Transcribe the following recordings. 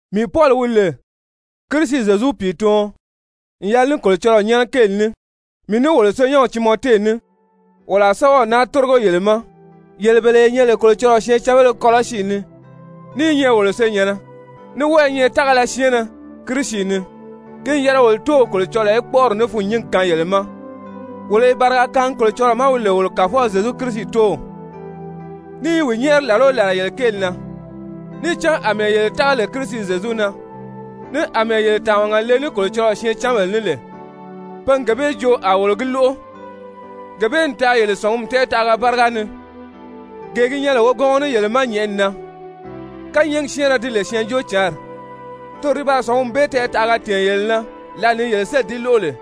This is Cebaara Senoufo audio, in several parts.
Mii Pɔli, wi lè Kirisi Zyezu pìituɔn n yɛlɛ ní Kolocɔlɔɔ nyɛ́nɛ kéeli ní, mii ní wolo senyɛnw Timɔte ní, wolo a sɛ́bɛw naa tórigo yele ma, yele bele ye nyɛ lè Kolocɔlɔɔ syɛɛncanbéle Kɔlɔsi ni, ní i nyɛ wolo senyɛ̀nnɛ, ní wɔ́ɔ i nyɛ tágala syɛɛnnɛ Kirisi ni, ki n yɛlɛ wolo Tóow Kolocɔlɔɔ í kpɔ́ʔɔri ní fûnnyingi kaan yele ma! Wolo i bariga kaangi Kolocɔlɔɔ ma wi lè wolo Kàfɔw Zyezu Kirisi Tóow, ní i wi nyɛ́ɛri làla o làla yele kéeli na. Níì cán àmɛɛ yele tága lè Kirisi Zyezu na, ní àmɛɛ yele tàmaga le ní Kolocɔlɔɔ syɛɛncanbèle ní lè, pe n gee bee joo a wolo gi lóʔo. Gee bee n taa yele sɔ̀ngumi tɛɛtaʔaga báriga ni, gee gi nyɛ lè wogɔngɔ ní yele ma nyɛ̀ʔɛni na, kányɛɛgi syɛ́ɛnrɛ ti lè Syɛɛnjóocǎnri, toro di baa sɔ̀ngumi bee tɛɛtaʔaga tɛ̀ɛn yele na lǎli ni yele sélì di lóʔo lè.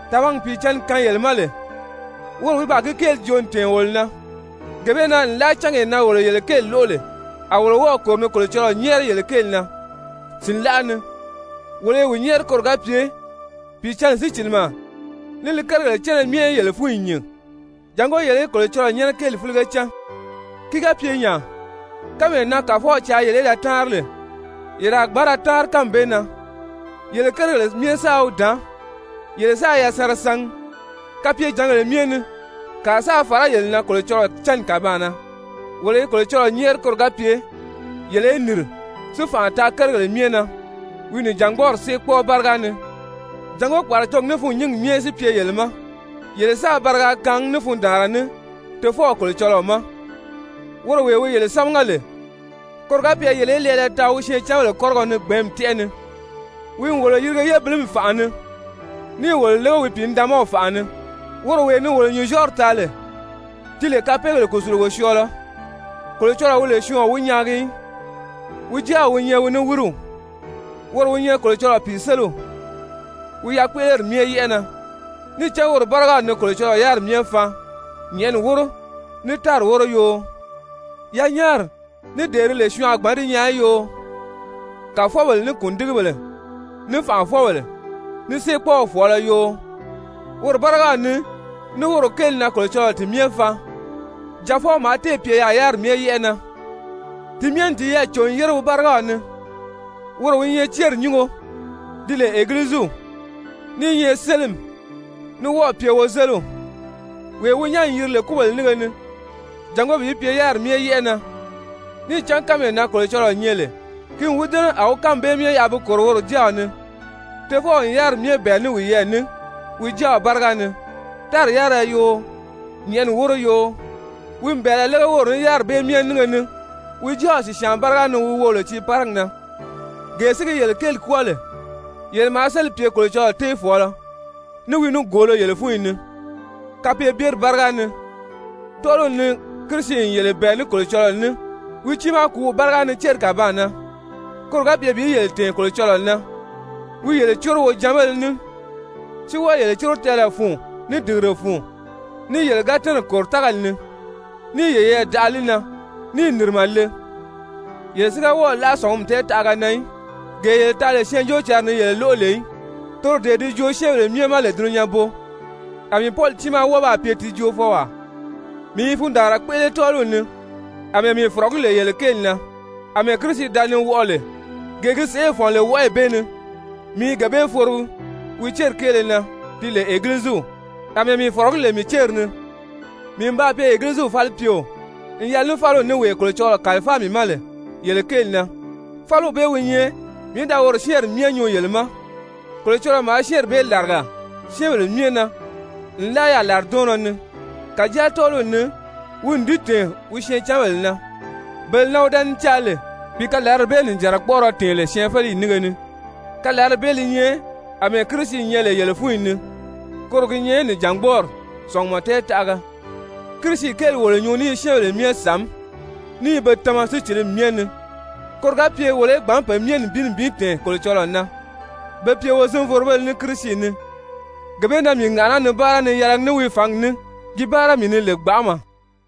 Tàmagi Pìicǎnni kaan yele ma lè, woro wi baa gi kéeli joo n tɛ̀ɛn wolo na. Gee bee na nlaa cángee na wolo yele kéeli lóʔo lè, a wolo wɔ́ɔ̀ kòro ni Kolocɔlɔɔ nyɛ́ɛri yele kéeli na sìnlaʔa ni, wolo i wi nyɛ́ɛri koro ga pye Pìicǎnni sícilimɛ ní li kérigèle cánna myɛ í yele fúnyi nyìn, jàngó yele í Kolocɔlɔɔ nyɛ́nɛ kéeli fílige cán. Ki ga pye nya, kánmee na Kàfɔw caa yele í da táanri lè, yele a gbǎn ra táanri kánmi bee na, yele kérigèle myɛ sáā wi dàán, yele sáā yasanra sangi kapyejǎngèle myɛ ni, kàa sáā fàrá yele na Kolocɔlɔɔ cánni kàbaan na. Wolo i Kolocɔlɔɔ nyɛ́ɛri koro ga pye yele í nìri si fànʔa taa kérigèle myɛ na wi nìjangbɔɔri séekpɔɔɔ báriga ni, jàngó kpàracogi ní fûnnyingi myɛ si pye yele ma, yele sáā bariga kaangi ní fundaanra ní Tofɔw Kolocɔlɔɔ ma, woro wee wi yele sámaga lè, koro ga pye yele í lɛɛlɛ taa wi syɛɛncanbèle kɔ́rigɔ ni gbɛ̀ɛ́nmi tɛ́ʔɛ ni. Wi n wolo yirige yébilimi fànʔa ni níì wolo lége wi Pìinidaanmaw fànʔa ni, woro wee ni wolo nyùnzyɔɔri taa lè, ti lè kapeegèle kùsulugo syɔɔlɔ. Kolocɔlɔɔ wi lè syɔɔn o wi nyaagi í, wi Jáaw wi nyɛ wi niwiriw, woro wi nyɛ Kolocɔlɔɔ pìiseliw wi yakpéʔeleri myɛ yɛ́ʔɛ na. Níì cán woro bárigaw ni Kolocɔlɔɔ yáriri myɛ faan, nyɛ̀ʔɛni wóro, ní tári wóro yoo, yanyaari, ní dee di lè syɔɔn a gbǎn di nyaa í yoo, kàfɔbèle, ní kùndigibèle, ní fànʔafɔbèle, ní séekpɔɔw fɔ̀ɔlɔ yoo, woro bárigaw ni, ní woro kéeli na Kolocɔlɔɔ ti myɛ faan. Jaafɔw maa téè pye yaà yáriri myɛ yɛ́ʔɛ na, ti myɛ n tiyɛɛ cò n yére wi bárigaw ni. Woro wi nyɛ céri nyúngo di lè Egiliziw, ní i nyɛ sélimi, ní wɔ́ɔ̀ pye wozeliw, wee wi nyán n yiri lè kúbèle nínge ni, jàngó bi pye yáriri myɛ yɛ́ʔɛ na. Níì cán kánmee na Kolocɔlɔɔ nyɛ lè, ki n wi dɛ́nɛ, a wi kánmi bee myɛ yaʔa bi kòro woro Jáaw ni. Tofɔw n yáriri myɛ bɛ̀ɛ ní wiyɛɛ ní wi Jáaw báriga ni, tári yárira yoo, nyɛ̀ʔɛni wóro yoo, wi n bɛ̀ɛlɛ lége woro ní yáriri bee myɛ nínge ni wi Jáaw sìsyaan báriga ni wi wo lè tiiparigi na. Gee si gi yele kéeli kwɔ́ɔ lè, yele maa sélì pye Kolocɔlɔɔ téefɔɔlɔ ní wi nigoolo yele fúnyi ni kapeebyeri báriga ni. Tɔ́ɔliw ni, Kirisi n yele bɛ̀ɛ ní Kolocɔlɔɔ ní wi tiimaa kùúw báriga ni céri kàbaan na, koro ga pye bi yele tɛ̀ɛn Kolocɔlɔɔ na, wi yele córo wojanbéle ní, si wɔ́ɔ yele córo tɛɛlɛ fun, ní dìgire fun, ní yele ga tɛ́nɛ̀ kòro tágali ni níì yeyɛɛ daʔa li na níì nìrimɛ le, yele si ga wɔ́ɔ̀ láʔa sɔ̀ngumi tɛɛtaʔaga na í, gee yele taa lè Syɛɛnjóocǎnri ni yele lóʔo lè í, toro dee di joo syɛ́ɛnbèle myɛ ma lè dulunyanbo, a mii Pɔli tiimaa wɔ́ɔ baa pye ti joofɔwaa. Mii i fundaanra kpéʔele tɔ́ɔliw ni àmɛɛ mii fɔ̀rɔgí lè yele kéeli na, àmɛɛ Kirisi da ni wɔʔɔ lè, gee gi sèʔê fɔ̀n lè wɔʔɔyi bee ni, mii i gee bee forogi wi céri kéele na di lè Egiliziw, àmɛɛ mii fɔ̀rɔgí lè mii céri ni. Mii n baa pye Egiliziw falipyeo n yɛlɛ ní fáliw ní, wee Kolocɔlɔɔ kàlifáa mii ma lè yele kéeli na. Fáliw bee wi nyɛ mii í da woro syɛ́ɛnri myɛ nyuu yele ma. Kolocɔlɔɔ maa syɛ́ɛnri bee làriga syɛ́ɛnbèle myɛ na nlaa yaà làridɔɔnnɔ ni, kàjáa tɔ́ɔliw ni wi n di tɛ̀ɛn wi syɛɛncanbèle na, bele na wi da ni caa lè bi kalarali bee nìjanra kpɔ́ʔɔrɔ tɛ̀ɛn lè syɛɛnfeleyi nínge ni, kalarali bee li nyɛ àmɛɛ Kirisi nyɛ lè yele fúnyi ni, koro gi nyɛ nìjangbɔɔri sɔ̀ngumɔ tɛɛtaʔaga. Kirisi kéeli wolo nyuu ní i syɛ́ɛnbèle myɛ sàmí, ní i pe myɛ tama sícilimi myɛ ni, koro ga pye wolo í gbǎn pe myɛ nibin nibin tɛ̀ɛn Kolocɔlɔɔ na be pye wozinvorobéle ní Kirisi ni. Gee bee na mii ŋàʔaná ni báara ni yɛlɛgi ní wi fǎngi ní gi báara mii ni lè gbanʔama.